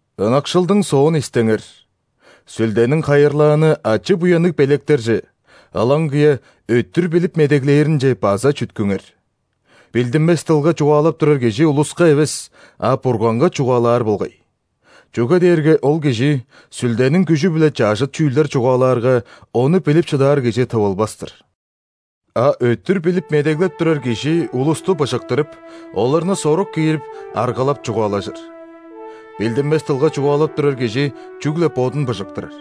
Ынакшылдың соон истеңер, Сүлдениң хайырлааны ачы-буянныг белектерже, ылаңгыя өттүр билип медеглээринче, база чүткүңер. Билдинмес дылга чугаалап турар кижи улуска эвес, а Бурганга чугаалаар болгай. Чүге дээрге ол кижи Сүлдениң күжү-биле чажыт чүүлдер чугаалаарга, ону билип шыдаар кижи тывылбас-тыр. А өттүр билип медеглеп турар кижи улусту быжыктырып, оларны сорук киирип, аргалап чугаалажыр. Билдинмес дылга чугаалап турар кижи чүгле бодун быжыктырар.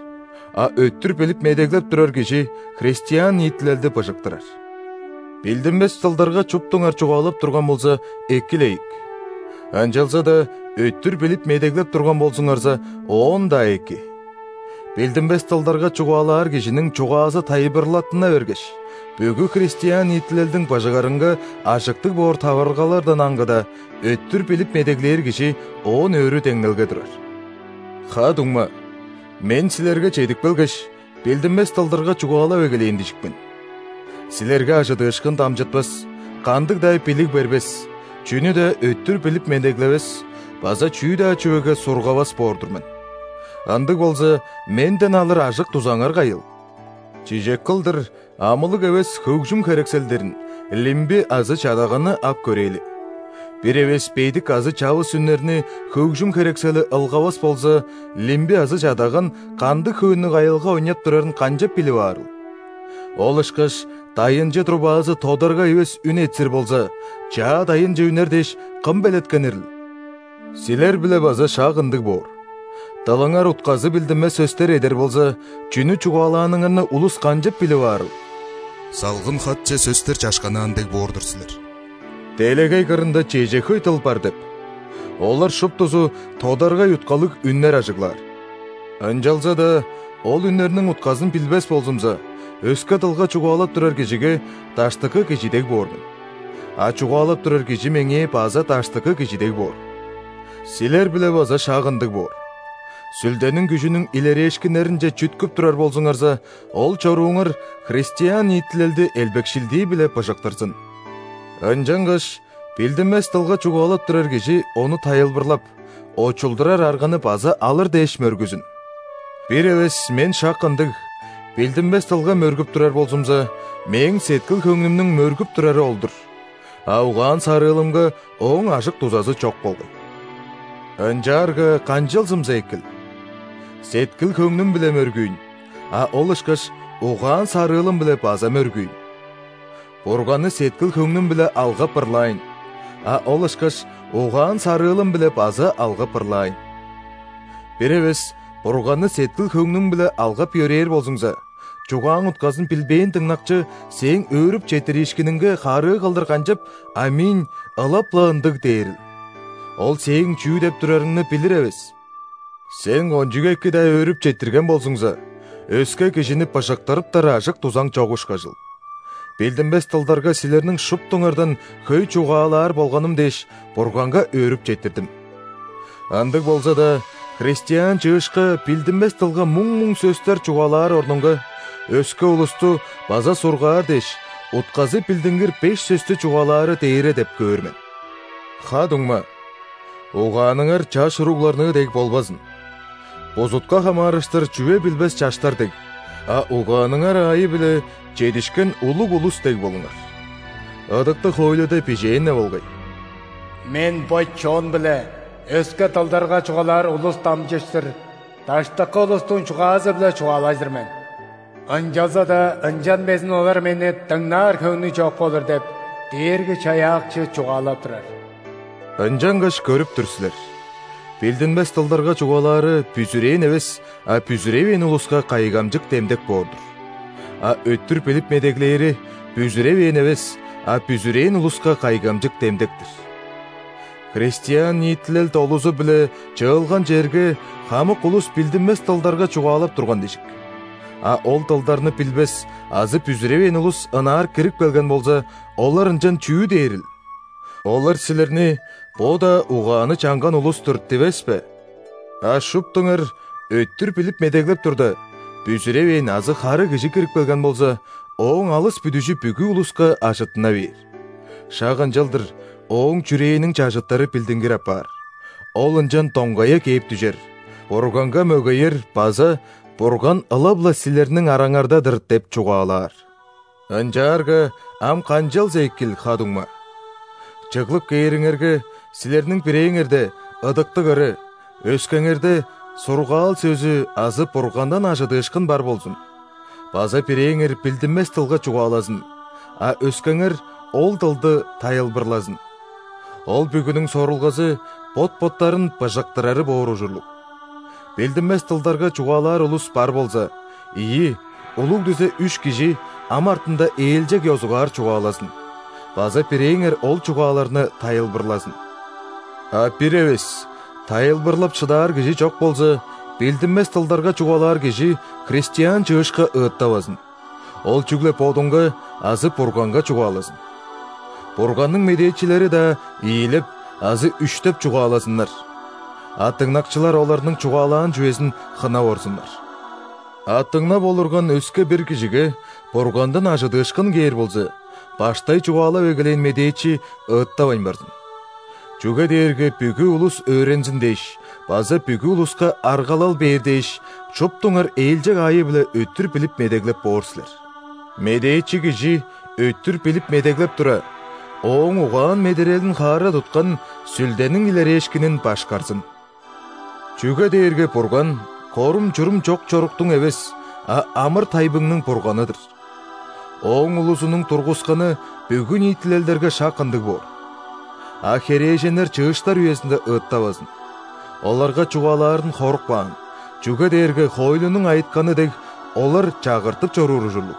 А өттүр билип медеглеп турар кижи христиан ниитилелди быжыктырар. Билдинмес дылдарга шуптуңар чугаалап турган болза, эки-ле ийик, ынчалза-даа өттүр билип медеглеп турган болзуңарза, оон-даа эки! Билдинмес дылдарга чугаалаар кижиниң чугаазы тайылбырлаттына бергеш, бүгү христиан ниитилелдиң быжыгарынга ажыктыг боор таварылгалардан аңгыда, өттүр билип медеглээр кижи оон өрү деңнелге турар. Ха-дуңма, мен силерге чедип келгеш, билдинмес дылдарга чугаалап эгелээн дижик мен. Силерге ·ажыдыышкын дамчытпас, кандыг-даа билиг бербес, чүнү-даа өттүр билип медеглевес база чүү-даа чүвеге сургавас боор-дур мен. Ындыг болза, менден алыр ажык-дузаңар кайыл? Чижек кылдыр амылыг эвес хөгжүм херекселдерин: лимби азы чадаганны ап көрээли. Бир эвес бедик азы чавыс үннерни хөгжүм херексели ылгавас болза, лимби азы чадаган кандыг хөөннүг аялга ойнап турарын канчап билип аарыл? Ол ышкаш дайынчы трубазы тодаргай эвес үн этсир болза, чаа-дайынче үнер дээш, кым белеткенирил? Силер-биле база шак ындыг боор: дылыңар утказы билдинмес сөстер эдер болза, чүнү чугаалааныңарны улус канчап билип аарыл? Салгын-хатче сөстер чашканнаан дег боор-дур силер. Делегей кырында чеже хөй дыл бар деп! Олар шуптузу тодаргай уткалыг үннер ажыглаар. Ынчалза-даа ол үннерниң утказын билбес болзумза, өске дылга чугаалап турар кижиге даштыкы кижи дег боор мен, а чугаалап турар кижи меңээ база даштыкы кижи дег боор. Силер-биле база шак ындыг боор: Сүлдениң күжүнүң илерээшкиннеринче чүткүп турар болзуңарза, ол чорууңар христиан ниитилелди элбекшилдии-биле быжыктырзын. Ынчангаш билдинмес дылга чугаалап турар кижи ону тайылбырлап, очулдурар арганы база алыр дээш мөргүзүн. Бир эвес мен шак ындыг, билдинмес дылга мөргүп турар болзумза, мээң сеткил-хөңнүмнүң мөргүп турары ол-дур, а угаан-сарыылымга ооң ажык-дузазы чок болгай. Ынчаарга канчалзымза экил? Сеткил-хөңнүм-биле мөргүүйн, а ол ышкаш угаан-сарыылым-биле база мөргүүйн! Бурганны сеткил-хөңнүм-биле алгап ырлаайн, а ол ышкаш угаан-сарыылым-биле база алгап ырлаайн! Бир эвес Бурганны сеткил-хөңнүң-биле алгап-йөрээр болзуңза, чугааң утказын билбээн дыңнакчы сээң өөрүп четтириишкиниңге харыы кылдыр канчап: «·Аминь – ылап-ла ындыг» дээрил? Ол сээң чүү деп турарыңны билир эвес! Сен кончуг эки-даа өөрүп четтирген болзуңза, өске кижини быжыктырыптар ажык-дузаң чок ышкажыл. Билдинмес дылдарга силерниң шуптуңардан хөй чугаалаар болганым дээш, Бурганга өөрүп четтирдим. Ындыг болза-даа, христиан чыышка билдинмес дылга муң-муң сөстер чугаалаар орнунга, өске улусту база сургаар дээш, утказы билдингир беш сөстү чугаалаары дээре деп көөр мен. Ха-дуңма, угааныңар чаш уругларныы дег болбазын. Бузутка хамаарыштыр чүве билбес чаштар дег, а угааныңар аайы-биле чедишкен улуг улус дег болуңар. Ыдыктыг хоойлуда бижээн-не болгай:«„Мен бо чон-биле өске дылдарга чугаалаар улус дамчыштыр,даштыкы улустуң чугаазы-биле чугаалажыр мен.Ынчалза-даа ынчан безин олар Мени дыңнаар хөңнү чок болур“ – деп,Дээрги-Чаяакчы чугаалап турар». Ынчангаш көрүп тур силер: билдинмес дылдарга чугаалаары – бүзүрээн эвес, а бүзүревээн улуска кайгамчык демдек боор-дур. А өттүр билип медеглээри – бүзүревээн эвес, а бүзүрээн улуска кайгамчык демдек-тир. Христиан ниитилел долузу-биле чыылган черге хамык улус билдинмес дылдарга чугаалап турган дижик. А ол дылдарны билбес азы бүзүревээн улус ынаар кирип келген болза, олар ынчан чүү дээрил? Олар силерни: «Бо-даа угааны чанган улус-тур» – дивес бе?! А шуптуңар өттүр билип медеглеп турда, бүзүревээн азы хары кижи кирип келген болза, ооң алыс бүдүжү бүгү улуска ажыттына бээр. Шак ынчалдыр ооң чүрээниң чажыттары билдингир апаар, ол ынчан доңгая кээп дүжер, Бурганга мөгеер база: «Бурган ылап-ла силерниң араңарда-дыр!» – деп чугаалаар. Ынчаарга ам канчалза экил, ха-дуңма? Чыглып кээриңерге, силерниң бирээңерде – ыдыктыг ыры, өскеңерде – сургаал сөзү азы Бургандан ·ажыдыышкын бар болзун; база бирээңер билдинмес дылга чугаалазын, а өскеңер ол дылды тайылбырлазын. Ол бүгүнүң сорулгазы – бот-боттарын быжыктырары боор ужурлуг. Билдинмес дылдарга чугаалаар улус бар болза, ийи, улуг дизе үш кижи, ам артында ээлчег ёзугаар чугаалазын, база бирээңер ол чугааларны тайылбырлазын. А бир эвес тайылбырлап шыдаар кижи чок болза, билдинмес дылдарга чугаалаар кижи христиан чыышка ыыттавазын, ол чүгле бодунга азы Бурганга чугаалазын. Бурганның медээчилери-даа ийилеп азы үштеп чугаалазыннар, а дыңнакчылар оларның чугаалаан чүвезин хынап орзуннар. А дыңнап олурган өске-бир кижиге Бургандан ажыдыышкын кээр болза, баштай чугаалап эгелээн медээчи ыыттавайн барзын. Чүге дээрге бүгү улус өөрензин дээш база бүгү улуска аргалал бээр дээш, шуптуңар ээлчег аайы-биле өттүр билип медеглеп боор силер. Медээчи кижи өттүр билип медеглеп тура, ооң угаан-медерелин хаара туткан Сүлдениң илерээшкинин башкарзын. Чүге дээрге Бурган – корум-чурум чок чоруктуң эвес, а амыр-тайбыңның Бурганы-дыр. Ооң улузунуң тургусканы бүгү ниитилелдерге шак ындыг боор. (А херээженнер чыыштар үезинде ыыттавазын. Оларга чугаалаарын хоруп каан, чүге дээрге хоойлунуң айытканы дег, олар чагыртып чоруур ужурлуг.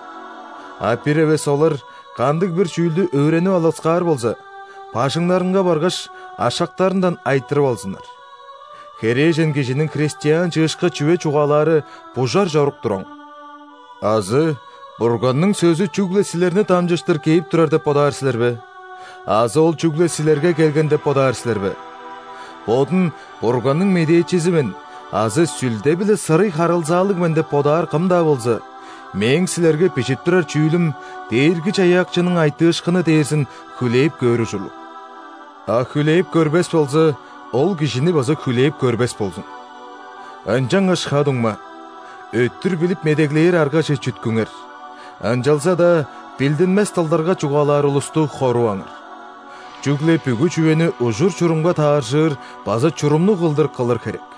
А бир эвес олар кандыг-бир чүүлдү өөренип алыксаар болза, бажыңнарынга баргаш, ашактарындан айтырып алзыннар. Херээжен кижиниң христиан чыышка чүве чугаалаары бужар чорук-тур оң.) Азы Бурганның сөзү чүгле силерни дамчыштыр кээп турар деп бодаар силер бе? Азы ол чүгле силерге келген деп бодаар силер бе? Бодун «Бурганның медээчизи мен» азы «Сүлде-биле сырый харылзаалыг мен» деп бодаар кым-даа болза, мээң силерге бижип турар чүүлүм Дээрги-Чаяакчының айтыышкыны дээрзин хүлээп көөр ужурлуг. А хүлээп көрбес болза, ол кижини база хүлээп көрбес болзун. Ынчангаш, ха-дуңма, өттүр билип медеглээр аргаже чүткүңер, ынчалза-даа билдинмес дылдарга чугаалаар улусту хоруваңар. Чүгле бүгү чүвени ужур-чурумга тааржыр база чурумнуг кылдыр кылыр херек.